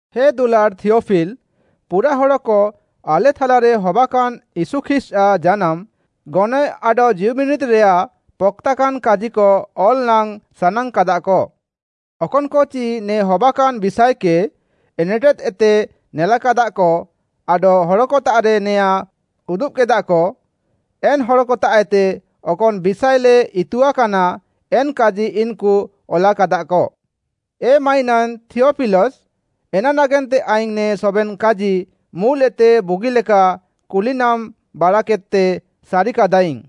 ହେ ଦୁଲାଡ଼୍‌ ଥିଅଫିଲ, ପୁରାଃ ହଡ଼କ ଆଲେ ଥାଲାରେ ହବାକାନ୍ ୟୀଶୁ ଖ୍ରୀଷ୍ଟ୍‌ଆଃ ଜାନାମ୍‌, ଗନଏଃ ଆଡଃ ଜୀଉବିନିରିଦ୍‌ରେୟାଃ ପକ୍‌ତାନ୍‌କାଜିକ ଅଲ୍‌ ନାଙ୍ଗ୍‌ ସାନାଙ୍ଗ୍‌କାଦାକ। ଅକନ୍‌କଚି ନେ ହବାକାନ୍‌ ବିଷାଏକେ ଏନେଟେଦ୍‌ଏତେ ନେଲାକାଦାଃକ ଆଡଃ ହଡ଼କତାଃରେ ନେୟାଁ ଉଦୁବ୍‌କେଦାଃକ, ଏନ୍‌ ହଡ଼କତାଃଏତେ ଅକନ୍‌ ବିଷାଏଲେ ଇତୁଆକାନା ଏନ୍‌କାଜି ଇନ୍‌କୁ ଅଲାକାଦାଃକ। ଏ ମାଇନାନ୍ ଥିୟଫିଲସ୍‌, ଏନାନାଗେନ୍ତେ ଆଇଙ୍ଗ୍‌ ନେ ସବେନ୍‌ କାଜି ମୁଲ୍‌ଏତେ ବୁଗିଲେକା କୁଲିନାମ୍‌ ବାଡ଼ାକେଦ୍‌ତେ ସାରିକାଦାଇଙ୍ଗ୍‌,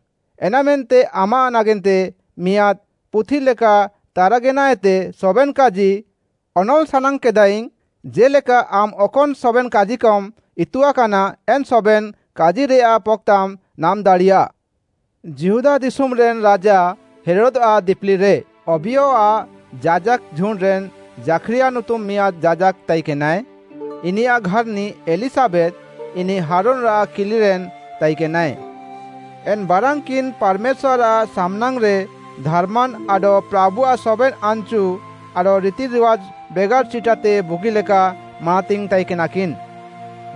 ଏନାମେନ୍ତେ ଆମାଃ ନାଗେନ୍ତେ ମିଆଁଦ୍‌ ପୁଥି ଲେକା ତାରାଗେନାଏତେ ସବେନ୍‌ କାଜି ଅନଲ୍‌ ସାନାଙ୍ଗ୍‌କେଦାଆଇଙ୍ଗ୍‌, ଜେ'ଲେକା ଆମ୍‌ ଅକନ୍‌ ସବେନ୍‌ କାଜିକମ୍ ଇତୁଆକାନା ଏନ୍‌ ସବେନ୍‌ କାଜିକରେୟାଃ ପକ୍‌ତାମ୍ ନାମ୍‌ଦାଡ଼ିୟାଃ। ଯିହୁଦା ଦିଶୁମ୍‌ରେନ୍ ରାଜା ହେରୋଦ୍‌ଆଃ ଦିପିଲିରେ ଅବିୟଆଃ ଯାଜାକ୍‌ ଝୁଣ୍ଡ୍‌ରେନ୍ ଜାଖ୍‌ରିୟା ନୁତୁମ୍‌ ମିଆଁଦ୍‌ ଯାଜାକ୍‌ ତାଇକେନାଏ। ଇନିୟାଃ ଘାର୍‌ନି ଏଲିଶାବେଥ୍‌, ଇନିଃ ହାରୁନ୍‌ଆଃ କିଲିରେନ୍ ତାଇକେନାଏ। ଏନ୍‌ ବାରାନ୍‌କିନ୍‌ ପାର୍‌ମେଶ୍ୱାର୍‌ଆଃ ସାମ୍‌ନାଙ୍ଗ୍‌ରେ ଧାର୍‌ମାନ୍‌ ଆଡଃ ପ୍ରାଭୁଆଃ ସବେନ୍‌ ଆନ୍‌ଚୁ ଆଡଃ ରିତିରିୱାଜ୍‌ ବେଗାର୍‌ ଚିଟାତେ ବୁଗିଲେକା ମାନାତିଙ୍ଗ୍‌ ତାଇକେନାକିନ୍‌।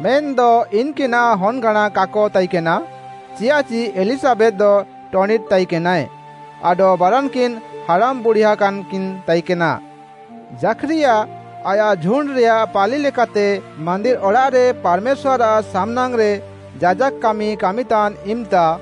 ମେନ୍‌ଦ ଇନ୍‌କିନାଃ ହନ୍‌ଗାଁଣା କାକ ତାଇକେନା, ଚିୟାଃଚି ଏଲିଶାବେଥ୍‌ଦ ଟଣିଟ୍‌ ତାଇକେନାଏ, ଆଡଃ ବାରାନ୍‌କିନ୍‌ ହାଡ଼ାମ୍ ବୁଢୀଆକାନ୍‌କିନ୍ ତାଇକେନା। ଜାଖ୍‌ରିୟା, ଆୟାଃ ଝୁଣ୍ଡ୍‌ରେୟାଃ ପାଳି ଲେକାତେ ମାନ୍ଦିର୍‌ ଅଡ଼ାଃରେ ପାର୍‌ମେଶ୍ୱାର୍‌ଆଃ ସାମ୍‌ନାଙ୍ଗ୍‌ରେ ଯାଜାକ୍‌ କାମି କାମିତାନ୍‍ ଇମ୍‌ତା,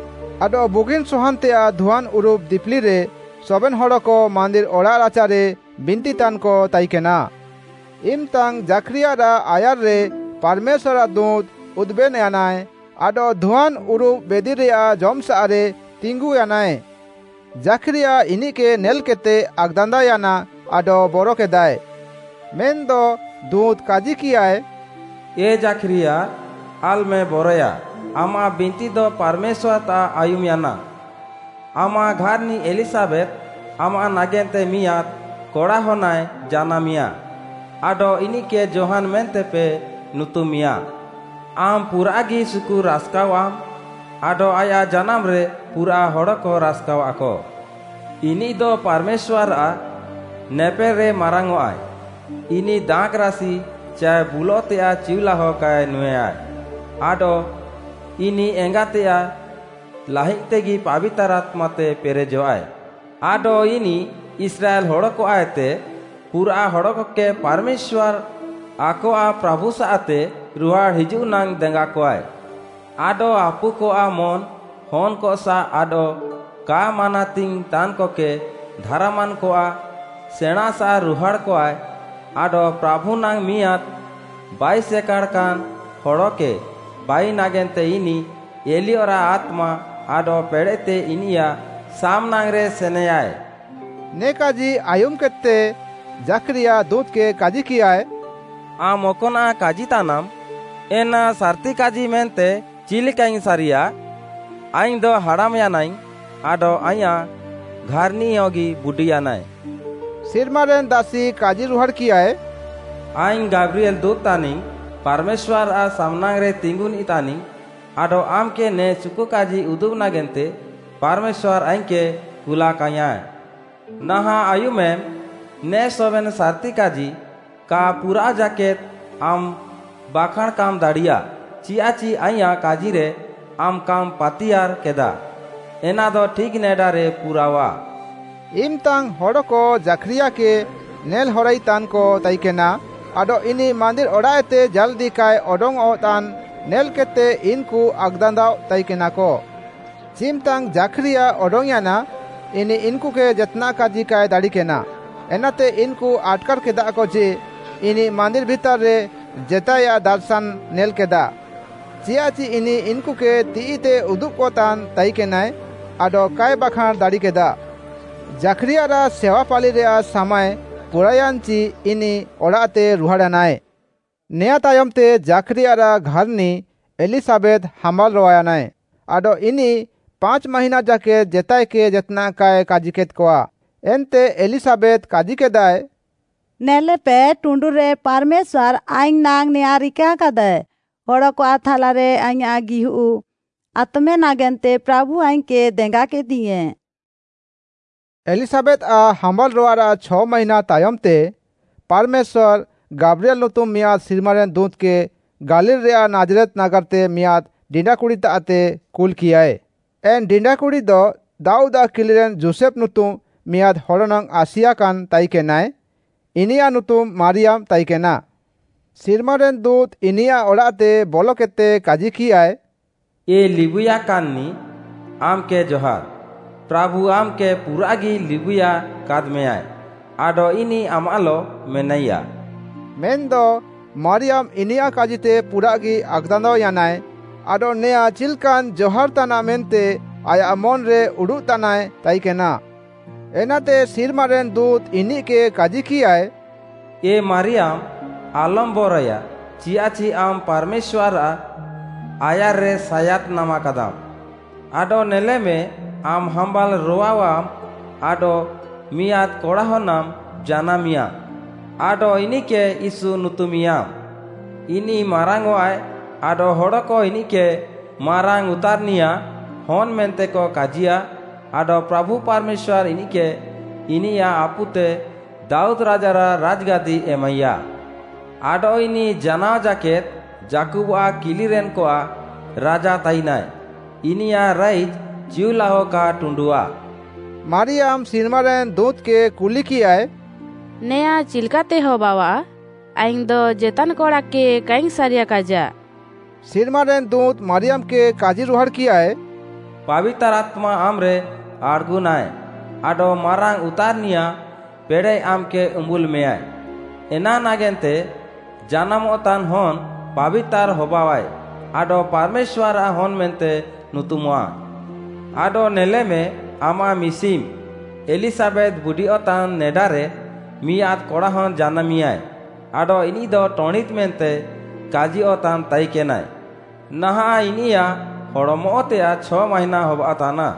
ଆଡଃ ବୁଗିନ୍‌ସୱାନ୍‌ତେୟାଃ ଧୁଆନ୍‌ ଉରୁବ୍ ଦିପିଲିରେ ସବେନ୍‌ ହଡ଼କ ମାନ୍ଦିର୍‌ ଅଡ଼ାଃରାଚାରେ ବିନ୍ତିତାନ୍‌କ ତାଇକେନା। ଇମ୍‌ତାଙ୍ଗ୍‌ ଜାଖ୍‌ରିୟାରାଃ ଆୟାର୍‌ରେ ପାର୍‌ମେଶ୍ୱାର୍‌ଆଃ ଦୁଁତ୍‌ ଉଦୁବେନ୍‌ୟାନାଏ ଆଡଃ ଧୁଆନ୍‌ ଉରୁବ୍ ବେଦିରେୟାଃ ଜମ୍‌ସାଃରେ ତିଙ୍ଗୁୟାନାଏ। ଜାଖ୍‌ରିୟା ଇନିଃକେ ନେଲ୍‌କେଦ୍‌ତେ ଆକ୍‌ଦାନ୍ଦାଅୟାନା ଆଡଃ ବରକେଦାଏ। ମେନ୍‌ଦ ଦୁଁତ୍‌ କାଜିକିୟାଏ, “ଏ ଜାଖ୍‌ରିୟା! ଆଲ୍‌ମେ ବରୟାଃ, ଆମାଃ ବିନ୍ତିଦ ପାର୍‌ମେଶ୍ୱାର୍‌ତାଃ ଆୟୁମ୍‌ୟାନା। ଆମାଃ ଘାର୍‌ନି ଏଲିଶାବେଥ୍‌ ଆମାଃ ନାଗେନ୍ତେ ମିଆଁଦ୍‌ କଡ଼ାହନ୍ଆଏ ଜାନାମିଁୟା, ଆଡଃ ଇନିଃକେ ଯୋହାନ୍‌ ମେନ୍ତେପେ ନୁତୁମିଁୟା। ଆମ୍‌ ପୁରାଃଗି ସୁକୁ ରାସ୍‌କାୱାମ୍ ଆଡଃ ଆୟାଃ ଜାନାମ୍‌ରେ ପୁରାଃ ହଡ଼କ ରାସ୍‌କାୱାଃକ। ଇନିଃଦ ପାର୍‌ମେଶ୍ୱାର୍‌ଆଃ ନେପେଲ୍‌ରେ ମାରାଙ୍ଗ୍‌ଅଃଆଏ, ଇନିଃ ଦାଖ୍‌ରାସି ଚାଏ ବୁଲଃତେୟାଃ ଚିଉଲାହ କାଏ ନୁଁଏୟା ଆଡଃ ଇନିଃ ଏଙ୍ଗାତେୟାଃ ଲାହିଦ୍‌ତେଗି ପାବିତାର୍‌ ଆତ୍ମାତେ ପେରେଜଃଆଏ, ଆଡଃ ଇନିଃ ଇସ୍ରାଏଲ୍‌ ହଡ଼କଆଃଏତେ ପୁରାଃ ହଡ଼କକେ ପାର୍‌ମେଶ୍ୱାର୍‌ ଆକଆଃ ପ୍ରାଭୁସାଃତେ ରୁହାଡ଼୍‌ ହିଜୁଃନାଙ୍ଗ୍‌ ଦେଙ୍ଗାକୱାଏ। ଆଡଃ ଆପୁକଆଃ ମନ୍‌ ହନ୍‌କସାଃ ଆଡଃ କା ମାନାତିଙ୍ଗ୍‌ ତାନ୍‌କକେ ଧାର୍‌ମାନ୍‌କଆଃ ସେଣାଁଁସାଃ ରୁହାଡ଼୍‌କଆଏ ଆଡଃ ପ୍ରାଭୁନାଙ୍ଗ୍‌ ମିଆଁଦ୍‌ ବାଇସେକାଡ଼ାକାନ୍‌ ହଡ଼କେ ବାଇନାଗେନ୍ତେ ଇନିଃ ଏଲିୟଆଃ ଆତ୍ମା ଆଡଃ ପେଡ଼େଃତେ ଇନିୟାଃ ସାମ୍‌ନାଙ୍ଗ୍‌ରେ ସେନେୟାଏ।” ନେ କାଜି ଆୟୁମ୍‌ କେଦ୍‌ତେ, ଜାଖ୍‌ରିୟା ଦୁଁତ୍‌କେ କାଜିକିୟାଏ, “ଆମ୍‌ ଅକ୍‌ନାଃ କାଜିତାନାମ୍, ଏନା ସାର୍‌ତି କାଜି ମେନ୍ତେ ଚିଲ୍‌କାଇଙ୍ଗ୍‌ ସାରିୟାଃ? ଆଇଙ୍ଗ୍‌ଦ ହାଡ଼ାମ୍ ୟାନାଇଙ୍ଗ୍‌ ଆଡଃ ଆଇଁୟାଃ ଘାର୍‌ନିୟଗି ବୁଡି ୟାନାଏ।” ସିର୍ମାରେନ୍‌ ଦାସି କାଜିରୁହାଡ଼୍‌କିୟାଏ, “ଆଇଙ୍ଗ୍‌ ଗାବ୍ରିଏଲ୍‌ ଦୁଁତ୍‌ ତାନିଙ୍ଗ୍‌, ପାର୍‌ମେଶ୍ୱାର୍‌ଆଃ ସାମ୍‌ନାଙ୍ଗ୍‌ରେ ତିଙ୍ଗୁନ୍‌ନିଃ ତାନିଙ୍ଗ୍‌ ଆଡଃ ଆମ୍‌କେ ନେ ସୁକୁକାଜି ଉଦୁବ୍‌ ନାଗେନ୍ତେ ପାର୍‌ମେଶ୍ୱାର୍‌ ଆଇଙ୍ଗ୍‌କେ କୁଲାକାଇଙ୍ଗ୍‌ୟାଁଏ। ନାହାଁଃ ଆୟୁମେମ୍, ନେ ସବେନ୍‌ ସାର୍‌ତି କାଜି କା ପୁରାଅଃ ଜାକେଦ୍‌ ଆମ୍‌ ବାଖାଁଣ୍‌ କାମ୍‌ ଦାଡ଼ିୟାଃ ଚିୟାଃଚି ଆଇଁୟାଃ କାଜିରେ ଆମ୍‌ କାମ୍‌ ପାତିୟାର୍ କେଦାଃ, ଏନାଦ ଠିକ୍‌ ନେଡାରେ ପୁରାଅଆଃ।” ଇମ୍‌ତାଙ୍ଗ୍‌ ହଡ଼କ ଜାଖ୍‌ରିୟାକେ ନେଲ୍‌ହରାଇତାନ୍‌କ ତାଇକେନା ଆଡଃ ଇନିଃ ମାନ୍ଦିର୍‌ ଅଡ଼ାଃଏତେ ଜାଲ୍‌ଦି କାଏ ଅଡଙ୍ଗ୍‌ଅଃତାନ୍‌ ନେଲ୍‌କେଦ୍‌ତେ ଇନ୍‌କୁ ଆକ୍‌ଦାନ୍ଦାଅଃ ତାଇକେନାକ। ଚିମ୍‌ତାଙ୍ଗ୍‌ ଜାଖ୍‌ରିୟା ଅଡଙ୍ଗ୍‌ୟାନା, ଇନିଃ ଇନ୍‌କୁକେ ଜେତ୍‌ନାଃ କାଜି କାଏ ଦାଡ଼ିକେନା। ଏନାତେ ଇନ୍‌କୁ ଆଟ୍‌କାର୍‌ କେଦାଃକ ଯେ ଇନିଃ ମାନ୍ଦିର୍‌ ଭିତାର୍‌ରେ ଜେତାଏୟାଃ ଦାର୍‌ଶାନ୍‌ନାଏ ନେଲ୍‌କାଦା, ଚିୟାଃଚି ଇନିଃ ଇନ୍‌କୁକେ ତିଃଇତେ ଉଦୁବ୍‌କତାନ୍ ତାଇକେନାଏ ଆଡଃ କାଏ ବାଖାଁଣ୍‌ ଦାଡ଼ିକେଦା। ଜାଖ୍‌ରିୟାରାଃ ସେୱା ପାଳିରେୟାଃ ସାମାଏ ପୁରାୟାନ୍‌ଚି ଇନିଃ ଅଡ଼ାଃତେ ରୁହାଡ଼୍‌ୟାନାଏ। ନେଆଁଁ ତାୟମ୍‌ତେ ଜାଖ୍‌ରିୟାରାଃ ଘାର୍‌ନି ଏଲିଶାବେଥ୍‌ ହାମ୍ବାଲ୍‌ ରୋୱାୟାନାଏ। ଆଡଃ ଇନିଃ ପାଞ୍ଚ୍‌ ମାହିଁନା ଜାକେଦ୍‌ ଜେତାଏକେ ଜେତ୍‌ନାଃ କାଏ କାଜିକେଦ୍‌କଆ। ଏନ୍ତେ ଏଲିଶାବେଥ୍ କାଜିକେଦାଏ, “ନେଲେପେ, ଟୁଣ୍ଡୁରେ ପାର୍‌ମେଶ୍ୱାର୍‌ ଆଇଙ୍ଗ୍‌ ନାଙ୍ଗ୍‌ ନେଆଁଁ ରିକାକାଦାଏ। ହଡ଼କଆଃ ଥାଲାରେ ଆଇଁୟାଃ ଗିହୁଃ ଆତମେ ନାଗେନ୍ତେ ପ୍ରାଭୁ ଆଇଙ୍ଗ୍‌କେ ଦେଙ୍ଗାକେଦିୟାଁ!” ଏଲିଶାବେଥ୍‌ଆଃ ହାମ୍ବାଲ୍‌ରୋୱାରାଃ ଛ ମାହିଁନା ତାୟମ୍‌ତେ ପାର୍‌ମେଶ୍ୱାର୍‌ ଗାବ୍ରିଏଲ୍‌ ନୁତୁମ୍‌ ମିଆଁଦ୍‌ ସିର୍ମାରେନ୍‌ ଦୁଁତ୍‌କେ ଗାଲିଲ୍‌ରେୟାଃ ନାଜ୍‌ରେତ୍‌ ନାଗାର୍‌ତେ ମିଆଁଦ୍‌ ଡିଣ୍ଡାକୁଡ଼ିତାଃତେ କୁଲ୍‌କିୟାଏ, ଏନ୍‌ ଡିଣ୍ଡାକୁଡ଼ିଦ ଦାଉଦ୍‌ଆଃ କିଲିରେନ୍ ଯୋଷେଫ୍‌ ନୁତୁମ୍‌ ମିଆଁଦ୍‌ ହଡ଼ନାଙ୍ଗ୍‌ ଆସିଆକାନାଏ ତାଇକେନା, ଇନିୟାଃ ନୁତୁମ୍‌ ମାରିୟାମ୍‌ ତାଇକେନା। ସିର୍ମାରେନ୍‌ ଦୁଁତ୍‌ ଇନିୟାଃ ଅଡ଼ାଃତେ ବଲକେଦ୍‌ତେ କାଜିକିୟାଏ, “ଏ ଲିବୁଇୟାକାନ୍‌ନିଃ, ଆମ୍‌କେ ଜହାର୍! ପ୍ରାଭୁ ଆମ୍‌କେ ପୁରାଃଗି ଲିବୁଇୟା କାଦ୍‌ମେଁୟାଏ ଆଡଃ ଇନିଃ ଆମାଃଲଃ ମେନାଇୟାଃ!” ମେନ୍‌ଦ ମାରିୟାମ୍‌ ଇନିୟାଃ କାଜିତେ ପୁରାଃଗି ଆକ୍‌ଦାନ୍ଦାଅୟାନା, ଆଡଃ ନେୟାଁ ଚିଲ୍‌କାନ୍ ଜହାର୍ ତାନାଃ ମେନ୍ତେ ଆୟାଃ ମନ୍‌ରେ ଉଡ଼ୁଃତାନାଏ ତାଇକେନା। ଏନାତେ ସିର୍ମାରେନ୍‌ ଦୁଁତ୍‌ ଇନିଃକେ କାଜିକିୟାଏ, “ଏ ମାରିୟାମ୍‌, ଆଲମ୍‌ ବରଏୟା, ଚିୟାଃଚି ଆମ୍‌ ପାର୍‌ମେଶ୍ୱାର୍‌ଆଃ ଆୟାର୍‌ରେ ସାୟାଦ୍‌ ନାମାକାଦାମ୍‌। ଆଡଃ ନେଲେମେ, ଆମ୍‌ ହାମ୍ବାଲ୍ ରୋୱାଅଃଆମ୍‌ ଆଡଃ ମିଆଁଦ୍‌ କଡ଼ାହନ୍‌ନାମ୍ ଜାନାମିଁୟା ଆଡଃ ଇନିଃକେ ୟୀଶୁ ନୁତୁମିଁୟାମ୍‌। ଇନିଃ ମାରାଙ୍ଗ୍‌ଅଃଆଏ ଆଡଃ ହଡ଼କ ଇନିଃକେ ମାରାଙ୍ଗ୍‌ ଉତାର୍‌ନିୟାଃ ହନ୍‌ ମେନ୍ତେକ କାଜିୟାଃ ଆଡଃ ପ୍ରାଭୁ ପାର୍‌ମେଶ୍ୱାର୍‌ ଇନିଃକେ ଇନିୟାଃ ଆପୁତେ ଦାଉଦ୍‌ ରାଜାରାଃ ରାଜ୍‌ଗାଦି ଏମାଇୟା। ଆଡଃ ଇନିଃ ଜାନାଅଜାକେଦ୍ ଯାକୁବ୍‌ଆଃ କିଲିରେନ୍‌କଆଃ ରାଜା ତାଇନାଏ, ଇନିୟାଃ ରାଇଜ୍‌ ଚିଉଲାଅ କା ଟୁଣ୍ଡୁଃଆ!” ମାରିୟାମ୍‌ ସିର୍ମାରେନ୍‌ ଦୁଁତ୍‌କେ କୁଲିକିୟାଏ, “ନେଆଁଁ ଚିଲ୍‌କାତେ ହବାଅଆଃ? ଆଇଙ୍ଗ୍‌ଦ ଜେତାନ୍‌ କଡ଼ାକେ କାଇଙ୍ଗ୍‌ ସାରିୟାକାଇଜାଃ।” ସିର୍ମାରେନ୍‌ ଦୁଁତ୍‌ ମାରିୟାମ୍‌କେ କାଜିରୁହାଡ଼୍‌କିୟାଏ, “ପାବିତାର୍‌ ଆତ୍ମା ଆମ୍‌ରେ ଆଡ଼୍‌ଗୁନାଏ ଆଡଃ ମାରାଙ୍ଗ୍‌ ଉତାର୍‌ନିୟାଃ ପେଡ଼େଃ ଆମ୍‌କେ ଉମ୍ବୁଲ୍ ମେଁୟାଏ। ଏନାନାଗେନ୍ତେ ଜାନାମଃତାନ୍ ହନ୍‌ ପାବିତାର୍‌ ହବାଅଃଆଏ ଆଡଃ ପାର୍‌ମେଶ୍ୱାର୍‌ଆଃ ହନ୍‌ ମେନ୍ତେ ନୁତୁମଃଆଏ। ଆଡଃ ନେଲେମେ, ଆମାଃ ମିଶିମ୍ ଏଲିଶାବେଥ୍‌ ବୁଡିୟଃତାନ୍ ନେଡାରେ ମିଆଁଦ୍‌ କଡ଼ାହନ୍‌ ଜାନାମିଁୟାଏ, ଆଡଃ ଇନିଃଦ ଟଣିଟ୍‌ ମେନ୍ତେ କାଜିୟଃତାନ୍ ତାଇକେନାଏ, ନାହାଁଃ ଇନିୟାଃ ହଡ଼୍‌ମଃତେୟାଃ ଛ ମାହିଁନା ହବାଅଃତାନା।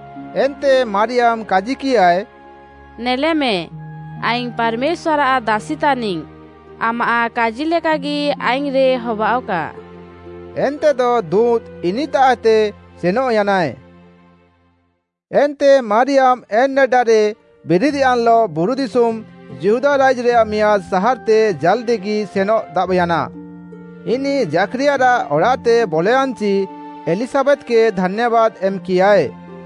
ଏନ୍ତେ ମାରିୟାମ୍‌ କାଜିକିୟାଏ, “ନେଲେମେ, ଆଇଙ୍ଗ୍‌ ପାର୍‌ମେଶ୍ୱାର୍‌ଆଃ ଦାସି ତାନିଙ୍ଗ୍‌ ଆମାଃ କାଜିଲେକାଗି ଆଇଙ୍ଗ୍‌ରେ ହବାଅଃକା,” ଏନ୍ତେଦ ଦୁଁତ୍‌ ଇନିଃତାଃଏତେ ସେନଃୟାନାଏ। ଏନ୍ତେ ମାରିୟାମ୍‌ ଏନ୍‌ ନେଡାରେ ବିରିଦ୍‌ୟାନ୍‌ଲଃ ବୁରୁଦିଶୁମ୍ ଯିହୁଦା ରାଇଜ୍‌ରେୟାଃ ମିଆଁଦ୍‌ ସାହାର୍‌ତେ ଜାଲ୍‌ଦିଗି ସେନଃ ଦାବ୍‌ୟାନା। ଇନିଃ ଜାଖ୍‌ରିୟାରାଃ ଅଡ଼ାଃତେ ବଲୟାନ୍‌ଚି ଏଲିଶାବେଥ୍‌କେ ଧାନ୍ୟାବାଦ୍‌ ଏମ୍‌କିୟାଏ।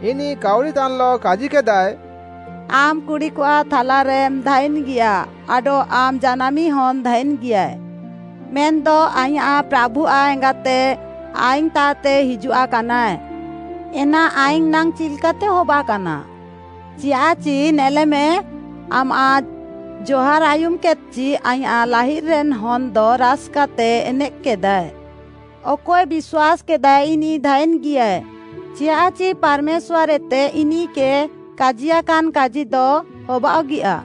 ଇନିଃ କାଉରିତାନ୍‌ଲଃ କାଜିକେଦାଏ, “ଆମ୍‌ କୁଡ଼ିକଆଃ ଥାଲାରେମ୍ ଧାଇନ୍‌ଗିୟାଃ ଆଡଃ ଆମ୍‌ ଜାନାମିଁ ହନ୍‌ ଧାଇନ୍‌ଗିୟାଏ! ମେନ୍‌ଦ ଆଇଁୟାଃ ପ୍ରାଭୁଆଃ ଏଙ୍ଗାତେ ଆଇଙ୍ଗ୍‌ତାଃତେ ହିଜୁଆକାନାଏ, ଏନା ଆଇଙ୍ଗ୍‌ ନାଙ୍ଗ୍‌ ଚିଲ୍‌କାତେ ହବାକାନା? ଚିୟାଃଚି, ନେଲେମେ, ଆମାଃ ଜହାର୍ ଆୟୁମ୍‌କେଦ୍‌ଚି ଆଇଁୟାଃ ଲାହିଦ୍‌ରେନ୍‌ ହନ୍‌ଦ ରାସ୍‌କାତେ ଏନେଃକ୍‌କେଦାଏ। ଅକଏ ବିଶ୍ୱାସ୍‌କେଦାଏ ଇନିଃ ଧାଇନ୍‌ଗିୟାଃଏ, ଚିୟାଃଚି ପାର୍‌ମେଶ୍ୱାର୍‌ତାଃଏତେ ଇନିଃକେ କାଜିୟାକାନ୍ କାଜିଦ ହବାଅଃଗିଆ!”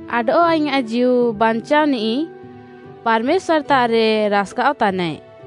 ଆଡଃ ଆଇଁୟାଃ ଜୀଉ ବାଞ୍ଚାଅନିଃ ପାର୍‌ମେଶ୍ୱାର୍‌ତାଃରେ ରାସ୍‌କାଅଃତାନାଏ,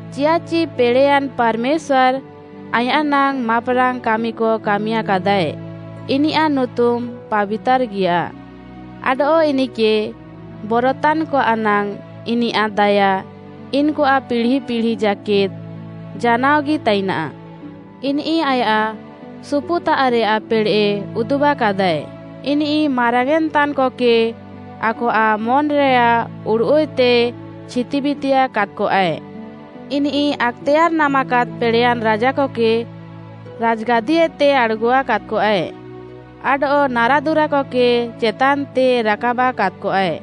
ଚିୟାଃଚି ପେଡ଼େୟାନ୍ ପାର୍‌ମେଶ୍ୱାର୍‌ ଆଇଁୟାଃନାଙ୍ଗ୍‌ ମାପ୍‌ରାଙ୍ଗ୍‌ କାମିକ କାମିୟାକାଦାଏ। ଇନିୟାଃ ନୁତୁମ୍‌ ପାବିତାର୍‌ଗିୟାଃ; ଆଡଃ ଇନିଃକେ ବରତାନ୍‌କଆଃନାଙ୍ଗ୍‌ ଇନିୟାଃ ଦାୟା ଇନ୍‌କୁଆଃ ପିଢ଼ି ପିଢ଼ି ଜାକେଦ୍‌ ଜାନାଅଗି ତାଇନାଃ। ଇନିଃ ଆୟାଃ ସୁପୁତାଃରେୟାଃ ପେଡ଼େଃ ଉଦୁବାକାଦାଏ। ଇନିଃ ମାରାଙ୍ଗ୍‌ୟେଁନ୍‌ ତାନ୍‌କକେ ଆକଆଃ ମନ୍‌ରେୟାଃ ଉଡ଼ୁଃଏତେ ଛିତିବିତିୟା କାଦ୍‌କଆଏ। ଇନିଃ ଆକ୍‌ତେୟାର୍‌ ନାମାକାଦ୍‌ ପେଡ଼େୟାନ୍‌ ରାଜାକକେ ରାଜ୍‌ଗାଦିଏତେ ଆଡ଼୍‌ଗୁଆ କାଦ୍‌କଆଏ, ଆଡଃ ନାରାଦୁରାକକେ ଚେତାନ୍‌ତେ ରାକାବା କାଦ୍‌କଆଏ।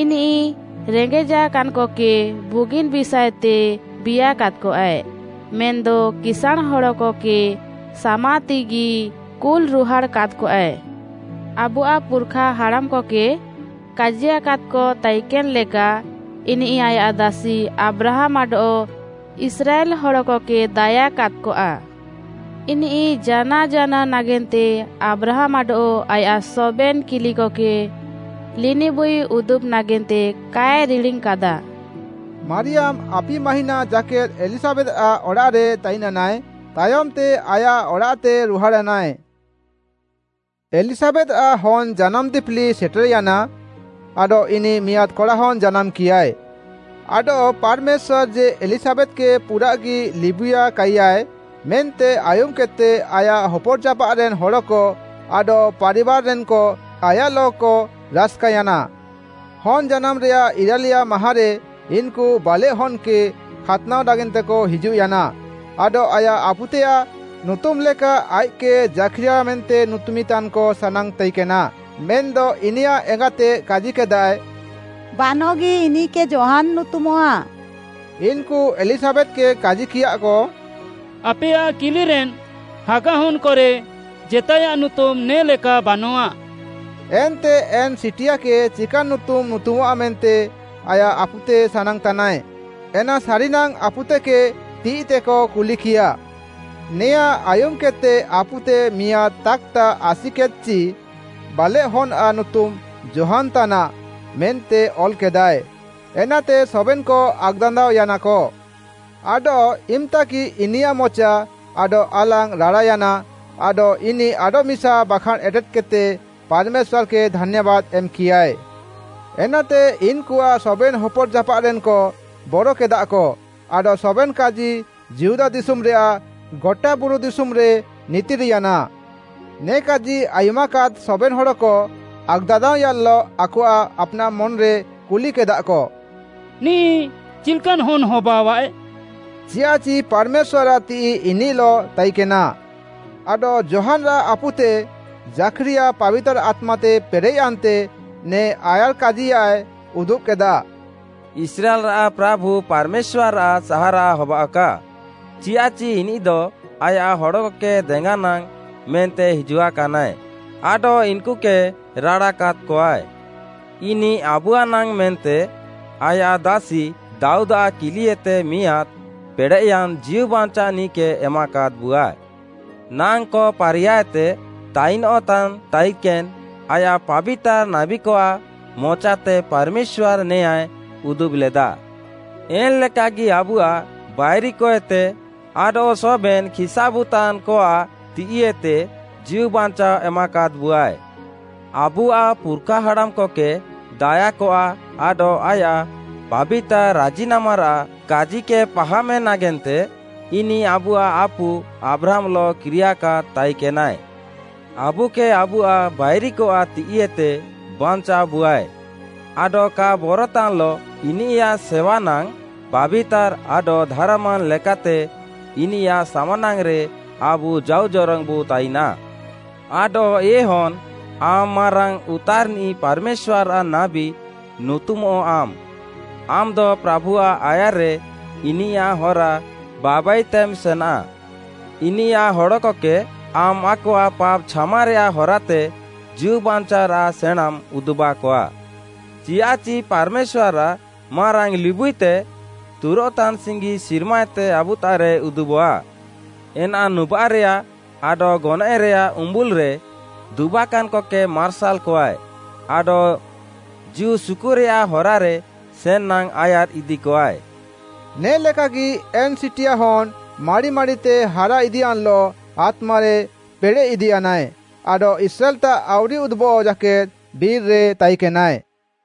ଇନିଃ ରେଙ୍ଗେଜାକାନ୍‌କକେ ବୁଗିନ୍‌ ବିଷାଏତେ ବିୟାକାଦ୍‌କଆଏ, ମେନ୍‌ଦ କିସାଁଣ୍‌ ହଡ଼କକେ ସାମା ତିଃଇଗି କୁଲ୍‌ରୁହାଡ଼୍‌ କାଦ୍‌କଆଏ। ଆବୁଆଃ ପୁର୍‌ଖାହାଡ଼ାମ୍‌କକେ କାଜିୟାକାଦ୍‌କ ତାଇକେନ୍‌ ଲେକା, ଇନିଃ ଆୟାଃ ଦାସି ଆବ୍ରାହାମ୍‌ ଆଡଃ ଇସ୍ରାଏଲ୍‌ ହଡ଼କକେ ଦାୟା କାଦ୍‌କଆ। ଇନିଃ ଜାନାଅ ଜାନାଅ ନାଗେନ୍ତେ ଆବ୍ରାହାମ୍‌ ଆଡଃ ଆୟାଃ ସବେନ୍‌ କିଲିକକେ ଲିନିବୁଇ ଉଦୁବ୍‌ ନାଗେନ୍ତେ କାଏ ରିଡ଼ିଙ୍ଗ୍‌କାଦା।” ମାରିୟାମ୍‌ ଆପି ମାହିଁନା ଜାକେଦ୍‌ ଏଲିଶାବେଥ୍‌ଆଃ ଅଡ଼ାଃରେ ତାଇନ୍‌ୟାନାଏ, ତାୟମ୍‌ତେ ଆୟାଃ ଅଡ଼ାଃତେ ରୁହାଡ଼୍‌ୟାନାଏ। ଏଲିଶାବେଥ୍‌ଆଃ ହନ୍‌ଜାନାମ୍‌ ଦିପିଲି ସେଟେର୍‌ୟାନା, ଆଡଃ ଇନିଃ ମିଆଁଦ୍‌ କଡ଼ାହନ୍‌ ଜାନାମ୍‌କିୟାଏ। ଆଡଃ ପାର୍‌ମେଶ୍ୱାର୍‌ ଯେ ଏଲିଶାବେଥ୍‌କେ ପୁରାଃଗି ଲିବୁଇୟାକାଇୟାଏ ମେନ୍ତେ ଆୟୁମ୍‌କେଦ୍‌ତେ ଆୟାଃ ହପର୍‌ଜାପାଃରେନ୍ ହଡ଼କ ଆଡଃ ପାରିବାର୍‌ରେନ୍‌କ ଆୟାଃଲଃକ ରାସ୍‌କାୟାନା। ହନ୍‌ ଜାନାମ୍‌ରେୟାଃ ଇରାଲିୟା ମାହାଁରେ ଇନ୍‌କୁ ବାଲେଃହନ୍‌କେ ଖାତ୍‌ନାଅ ନାଗେନ୍ତେକ ହିଜୁଃୟାନା, ଆଡଃ ଆୟାଃ ଆପୁତେୟାଃ ନୁତୁମ୍‌ଲେକା ଆଇଃକ୍‌କେ ଜାଖ୍‌ରିୟା ମେନ୍ତେ ନୁତୁମିଁ ତାନ୍‌କ ସାନାଙ୍ଗ୍‌ ତାଇକେନା, ମେନ୍‌ଦ ଇନିୟାଃ ଏଙ୍ଗାତେ କାଜିକେଦାଏ, “ବାନଃଗି ଇନିଃକେ ଯୋହାନ୍‌ ନୁତୁମଃଆ।” ଇନ୍‌କୁ ଏଲିଶାବେଥ୍‌କେ କାଜିକିୟାଃକ, “ଆପେୟାଃ କିଲିରେନ୍ ହାଗା ହନ୍‌କରେ ଜେତାଏୟାଃ ନୁତୁମ୍‌ ନେ ଲେକା ବାନଃଆ!” ଏନ୍ତେ ଏନ୍‌ ସିଟିଆକେ ଚିକାନ୍‌ ନୁତୁମ୍‌ ନୁତୁମଃଆ ମେନ୍ତେ ଆୟାଃ ଆପୁତେ ସାନାଙ୍ଗ୍‌ତାନାଏ, ଏନା ସାରିନାଙ୍ଗ୍‌ ଆପୁତେକେ ତିଃଇତେକ କୁଲିକିୟାଃ। ନେୟାଁ ଆୟୁମ୍‌କେଦ୍‌ତେ ଆପୁତେ ମିଆଁଦ୍‌ ତାକ୍‌ତା ଆସିକେଦ୍‌ଚି, “ବାଲେଃହନ୍‌ଆଃ ନୁତୁମ୍‌ ଯୋହାନ୍‌ ତାନାଃ” ମେନ୍ତେ ଅଲ୍‌କେଦାଏ, ଏନାତେ ସବେନ୍‌କ ଆକ୍‌ଦାନ୍ଦାଅୟାନାକ। ଆଡଃ ଇମ୍‌ତାଗି ଇନିୟାଃ ମଚା ଆଡଃ ଆଲାଙ୍ଗ୍‌ ରାଡ଼ାୟାନା ଆଡଃ ଇନିଃ ଆଡଃମିସା ବାଖାଁଣ୍‌ ଏଟେଦ୍‌କେଦ୍‌ତେ ପାର୍‌ମେଶ୍ୱାର୍‌କେ ଧାନ୍ୟାବାଦ୍‌ ଏମ୍‌କିୟାଏ। ଏନାତେ ଇନ୍‌କୁଆଃ ସବେନ୍‌ ହପର୍‌ଜାପାଃରେନ୍‌କ ବରକେଦାଃକ, ଆଡଃ ସବେନ୍‌ କାଜି ଯିହୁଦା ଦିଶୁମ୍‌ରେୟାଃ ଗଟା ବୁରୁ ଦିଶୁମ୍‌ରେ ଉମିନ୍‌ୟାନା। ନେ କାଜି ଆୟୁମାକାଦ୍ ସବେନ୍‌ ହଡ଼କ ଆକ୍‌ଦାନ୍ଦାଅୟାନ୍‌ଲଃ ଆକଆଃ ଆପ୍‌ନାଃ ମନ୍‌ରେ କୁଲିକେଦାଃକ, “ନିଃ ଚିଲ୍‌କାନ୍‌ ହନ୍‌ନାଏ ହବାଅଆଃ?” ଚିୟାଃଚି ପାର୍‌ମେଶ୍ୱାର୍‌ଆଃ ତିଃଇ ଇନିଃଲଃ ତାଇକେନା। ଆଡଃ ଯୋହାନ୍‌ଆଃ ଆପୁତେ ଜାଖ୍‌ରିୟା ପାବିତାର୍‌ ଆତ୍ମାତେ ପେରେଃୟାନ୍ତେ, ନେ ଆୟାର୍‌କାଜିୟାଏ ଉଦୁବ୍‌କେଦାଃ: “ଇସ୍ରାଏଲ୍‌ଆଃ ପ୍ରାଭୁ ପାର୍‌ମେଶ୍ୱାର୍‌ଆଃ ସାହାରାଅ ହବାଅଃକା! ଚିୟାଃଚି ଇନିଃଦ ଆୟାଃ ହଡ଼କକେ ଦେଙ୍ଗାନାଙ୍ଗ୍‌ ମେନ୍ତେ ହିଜୁଆକାନାଏ ଆଡଃ ଇନ୍‌କୁକେ ରାଡ଼ା କାଦ୍‌କଆଏ। ଇନିଃ ଆବୁଆଃନାଙ୍ଗ୍‌ ମେନ୍ତେ ଆୟାଃ ଦାସି ଦାଉଦ୍‌ଆଃ କିଲିଏତେ ମିଆଁଦ୍‌ ପେଡ଼େୟାନ୍‌ ଜୀଉବାଞ୍ଚାଅନିଃକେ ଏମାକାଦ୍‌ବୁଆଏ। ନାଙ୍କ ପାରିୟାଏତେ ତାଇନଃତାନ୍ ତାଇକେନ୍‌ ଆୟାଃ ପାବିତାର୍‌ ନାବୀକଆଃ ମଚାତେ ପାର୍‌ମେଶ୍ୱାର୍‌ ନେୟାଁଏ ଉଦୁବ୍‌ଲେଦା। ଏନ୍‌ଲେକାଗି ଆବୁଆଃ ବାଇରିକଏତେ ଆଡଃ ସବେନ୍‌ ଖିସ୍‌ଆବୁତାନ୍‌କଆଃ ତିଃଇଏତେ ଜୀଉବାଞ୍ଚାଅ ଏମାକାଦ୍‌ବୁଆଏ। ଆବୁଆଃ ପୁର୍‌ଖାହାଡ଼ାମ୍‌କକେ ଦାୟାକଆ ଆଡଃ ଆୟାଃ ପାବିତାର୍‌ ରାଜିନାମାରାଃ କାଜିକେ ପାହାମେ ନାଗେନ୍ତେ, ଇନିଃ ଆବୁଆଃ ଆପୁ ଆବ୍ରାହାମ୍‌ଲଃ କିରିୟାକାଦ୍‌ ତାଇକେନାଏ। ଆବୁକେ ଆବୁଆଃ ବାଇରିକଆଃ ତିଃଇଏତେ ବାଞ୍ଚାଅବୁଆଏ, ଆଡଃ କା ବରତାନ୍‌ଲଃ ଇନିୟାଃ ସେୱାନାଙ୍ଗ୍‌, ପାବିତାର୍‌ ଆଡଃ ଧାର୍‌ମାନ୍‌ ଲେକାତେ ଇନିୟାଃ ସାମ୍‌ନାଙ୍ଗ୍‌ରେ ଆବୁ ଜାଉଜରଙ୍ଗ୍‌ବୁ ତାଇନାଃ। ଆଡଃ ଏ ହନ୍‌, ଆମ୍‌ ମାରାଙ୍ଗ୍‌ ଉତାର୍‌ନିଃ ପାର୍‌ମେଶ୍ୱାର୍‌ଆଃ ନାବୀ ନୁତୁମଃଆମ୍‌ ଆମ୍‌ଦ ପ୍ରାଭୁଆଃ ଆୟାର୍‌ରେ ଇନିୟାଃ ହରା ବାବାଇତେମ୍ ସେନାଃ। ଇନିୟାଃ ହଡ଼କକେ ଆମ୍‌ ଆକଆଃ ପାପ୍‌ ଛାମାରେୟାଃ ହରାତେ ଜୀଉବାଞ୍ଚାଅରାଃ ସେଣାଁଁମ୍‌ ଉଦୁବାକଆ। ଚିୟାଃଚି ପାର୍‌ମେଶ୍ୱାର୍‌ଆଃ ମାରାଙ୍ଗ୍‌ ଲିବୁଇତେ ତୁରୋଃତାନ୍ ସିଙ୍ଗି ସିର୍ମାଏତେ ଆବୁତାଃରେ ଉଦୁବଃଆ। ଏନା ନୁବାଃରେୟାଃ ଆଡଃ ଗନଏଃରେୟାଃ ଉମ୍ବୁଲ୍‌ରେ ଦୁବାକାନ୍‌କକେ ମାର୍ସାଲ୍‌କଆଏ, ଆଡଃ ଜୀଉ ସୁକୁରେୟାଃ ହରାରେ ସେନ୍‌ନାଙ୍ଗ୍‌ ଆୟାର୍‌ ଇଦିକଆଏ।” ନେ ଲେକାଗି ଏନ୍‌ ସିଟିଆ ହନ୍‌ ମାଡ଼ି ମାଡ଼ିତେ ହାରା ଇଦିୟାନ୍‌ଲଃ ଆତ୍ମାରେ ପେଡ଼େଃ ଇଦିୟାନାଏ, ଆଡଃ ଇସ୍ରାଏଲ୍‌ତାଃ ଆଉରି ଉଦୁବଃ ଜାକେଦ୍‌ ବିର୍‌ରେ ତାଇକେନାଏ।